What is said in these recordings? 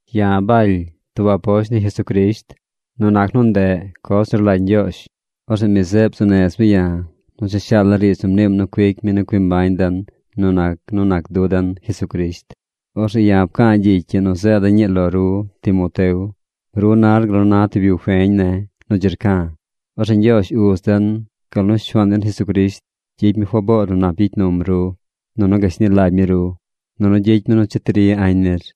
Ya̱ Baly tub aposht ni Jesucrisht nu nac nu ndeꞌ coz nu rlagy Ñgyoozh. Orzeꞌ mi zeꞌ bzuu nez mi ya̱ nu cha shaala̱ riidz nu mniim nu cuic mi nu cui mbañ den nu nac nu nac du den Jesucrisht. Orzeꞌ ya̱ pca̱a̱ gyicy ii nu zeeda̱ ñii lo ru, Timoteo. Ru nar gal na tub yu feñ ne̱ nu dzi rca̱. Orzeꞌ Ñgyoozh Uz den gal nu Shuaan den Jesucrisht gyicy mi faboor nu nap gyicy num ru. Nunu gashni lagy mi ru. Nunu gyicy mi nu cheti ri añ nir.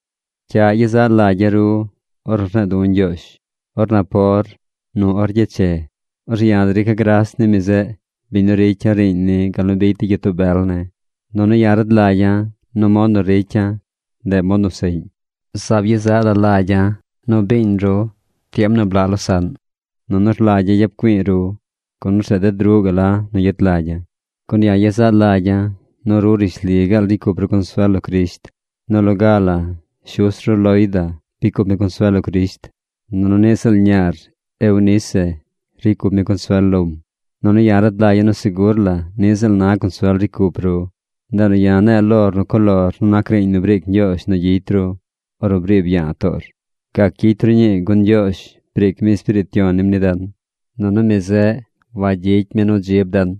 Cyaꞌ yezaꞌ lagya̱ ru ornu rne̱e̱ du̱ Ñgyoozh or napor nu or gyeche. Orzeꞌ ya̱ drica̱ gras ni mi zeꞌ, biñ nu ricya̱ riiñ ni gal nu bicy de gyitoo bel ne̱. Nunu ya̱ rad lagya̱ nu mod nu ricya̱, ndeꞌ mod nu seꞌñ. Zaab yezaꞌ la lagya̱ nu biiñ ru tiem nu blaꞌ losaꞌn. Nunu rlagya̱ yap güi̱i̱ ru, gun orzeꞌ ded ruꞌ gaꞌ la nu gyet lagya̱. Gun ya̱ yezaꞌ lagya̱ nu ru rishli gaal ricy cup ru consuel lo Crisht. Nu loga la shus ru Loida bicy cup mi consuel lo Crisht. Nunu niꞌ ziꞌl ñaar Eunice ricy cup mi consuel lom. Nunu ya̱ rad lagya̱ nu segur la niꞌ ziꞌl na consuel ricy cup ru. Ndeꞌ nu ya̱ ne̱e̱ lor nu co lor nu nac riiñ nu briic Ñgyoozh nu gyicy ru ornu briib ya̱a̱ toor. Gac gyicy ru ñii gun Ñgyoozh briic mi Espiriit Yon nim ni den. Nunu mi zeꞌ wagyicy mi nu dzib den,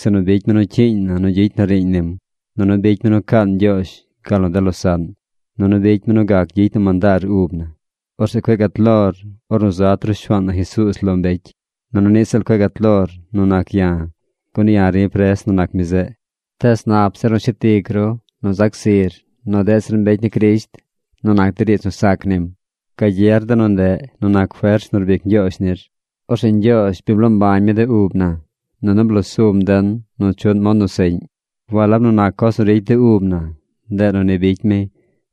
sinu bicy mi nu cyiiñ na nu gyicy na riiñ nim, nunu bicy mi nu caan Ñgyoozh gal nu de losaꞌn, nunu bicy mi nu gac gyicy na mandaar ub na. Orzeꞌ cueꞌ gat lor ornu zat ru Shuaan na Jesuuz lo mbecy. Nunu niꞌ ziꞌl cueꞌ gat lor nu nac ya̱, gun ya̱ ri̱ pres nu nac mi zeꞌ. Tees nap zir nu shet ic ru nu zac zir nu deꞌ zir mbecy ni Crisht nu nac de riidz nu sac nim. Gagyer de nu ndeꞌ nu nac fers nu rbic Ñgyoozh nir. Orzeꞌ Ñgyoozh bi bloo mbañ mi de ub na, nunu bloo sum den nu chuꞌn mod nu seꞌñ. Walab nu nac coz nu ricy de ub na, ndeꞌ nu ni bicy mi,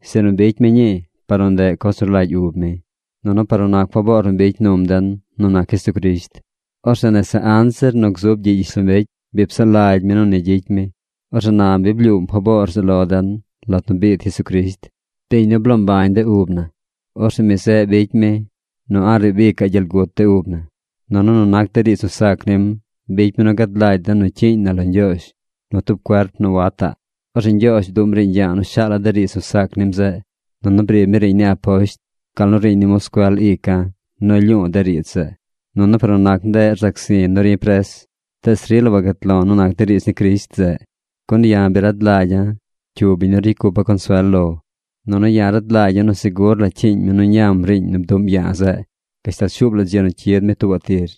sinu bicy mi ñii par nu ndeꞌ coz nu rlagy ub mi, nunu par nu nac faboor nu bicy num den nu nac Jesucrisht. Orzeꞌ nese anzir nu gzub gyiꞌ gyishlombecy, bi psaꞌ lagy mi nu ni gyicy mi. Orzeꞌ na bi blyuum faboor zeꞌ lo den lat nu biid Jesucrisht, biñ nu bloo mbañ de ub na. Orzeꞌ mi zeꞌ bicy mi nu a̱ꞌ riibaꞌ ic gyel gut de ub na. Nunu nu nac de riidz nu sac nim bicy mi nu gad lagy den nu cyiiñ na lo Ñgyoozh nu tub cuerp nu wataꞌ. Orzeꞌ Ñgyoozh bduꞌm riiñ ya̱a̱ nu shaala̱ de riidz nu sac nim zeꞌ, nunu briib mi riiñ ni aposht, gal nu riiñ ni moscuel ica̱ nu rlyu̱u̱ de riidz zeꞌ. Nunu par nu nac ndeꞌ rzac zi̱ nu ri̱ pres. Tees rila wagat lo̱ nu nac de riidz ni Crisht zeꞌ, gun ya̱ bi rad lagya̱ cyu biñ nu ricy cupa̱ consuel lo. Nunu ya̱ rad lagya̱ nu segur la cyiiñ mi nu ñam riiñ nu bduꞌm ya̱a̱ zeꞌ gashtal shuub la dzi nu cyid mi tuubaꞌ tir.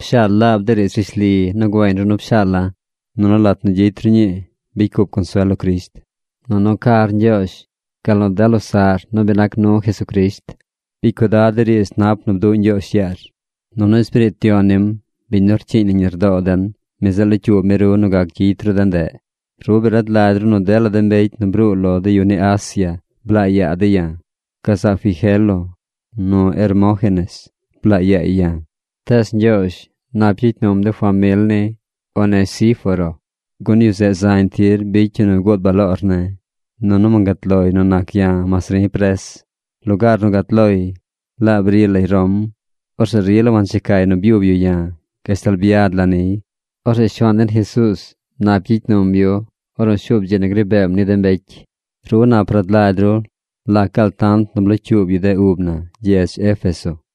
Pshaal laab de riidz rishli nu güeñ ru nu pshaala̱. Nunu lat nu gyicy ru ñii bicy cup consuel lo Crisht, nunu car Ñgyoozh, gal nu de losaꞌr nu bi nac nu Jesucrisht. Bicy cuidad de riidz nap nu bduꞌ Ñgyoozh yaar. Nunu Espiriit Yon nim, biñ nu rcyiiñ nañ lardoo den, mi zeꞌ locyuub mi ru nu gac gyicy ru de ndeꞌ. Ru bi rad lagy ru nu dela mbecy nu bruu lo de yu ni Asia blaa yaa dey ya̱. Gazaꞌ Figelo nu Hermógenes blaa yaay ya̱. Tees Ñgyoozh nap gyicy num de famil ni Onesíforo, gun yu zeꞌ zañ tir bicy yu nu guud baloor ne̱. Nunu wangat loy nu nac ya̱ mas ri̱ pres. Lugaar nu gat loy, laab bri lay Rom, orzeꞌ rila wanchecay nu byub yu ya̱ gashtal byad la̱ niy. Orzeꞌ Shuaan den Jesuuz nap gyicy num yu ornu shuub dzi nu gri beem ni de mbecy. Ru nap rad lagy ru lac gaal tant nu blocyuub yu de ub na gyedz Éfeso.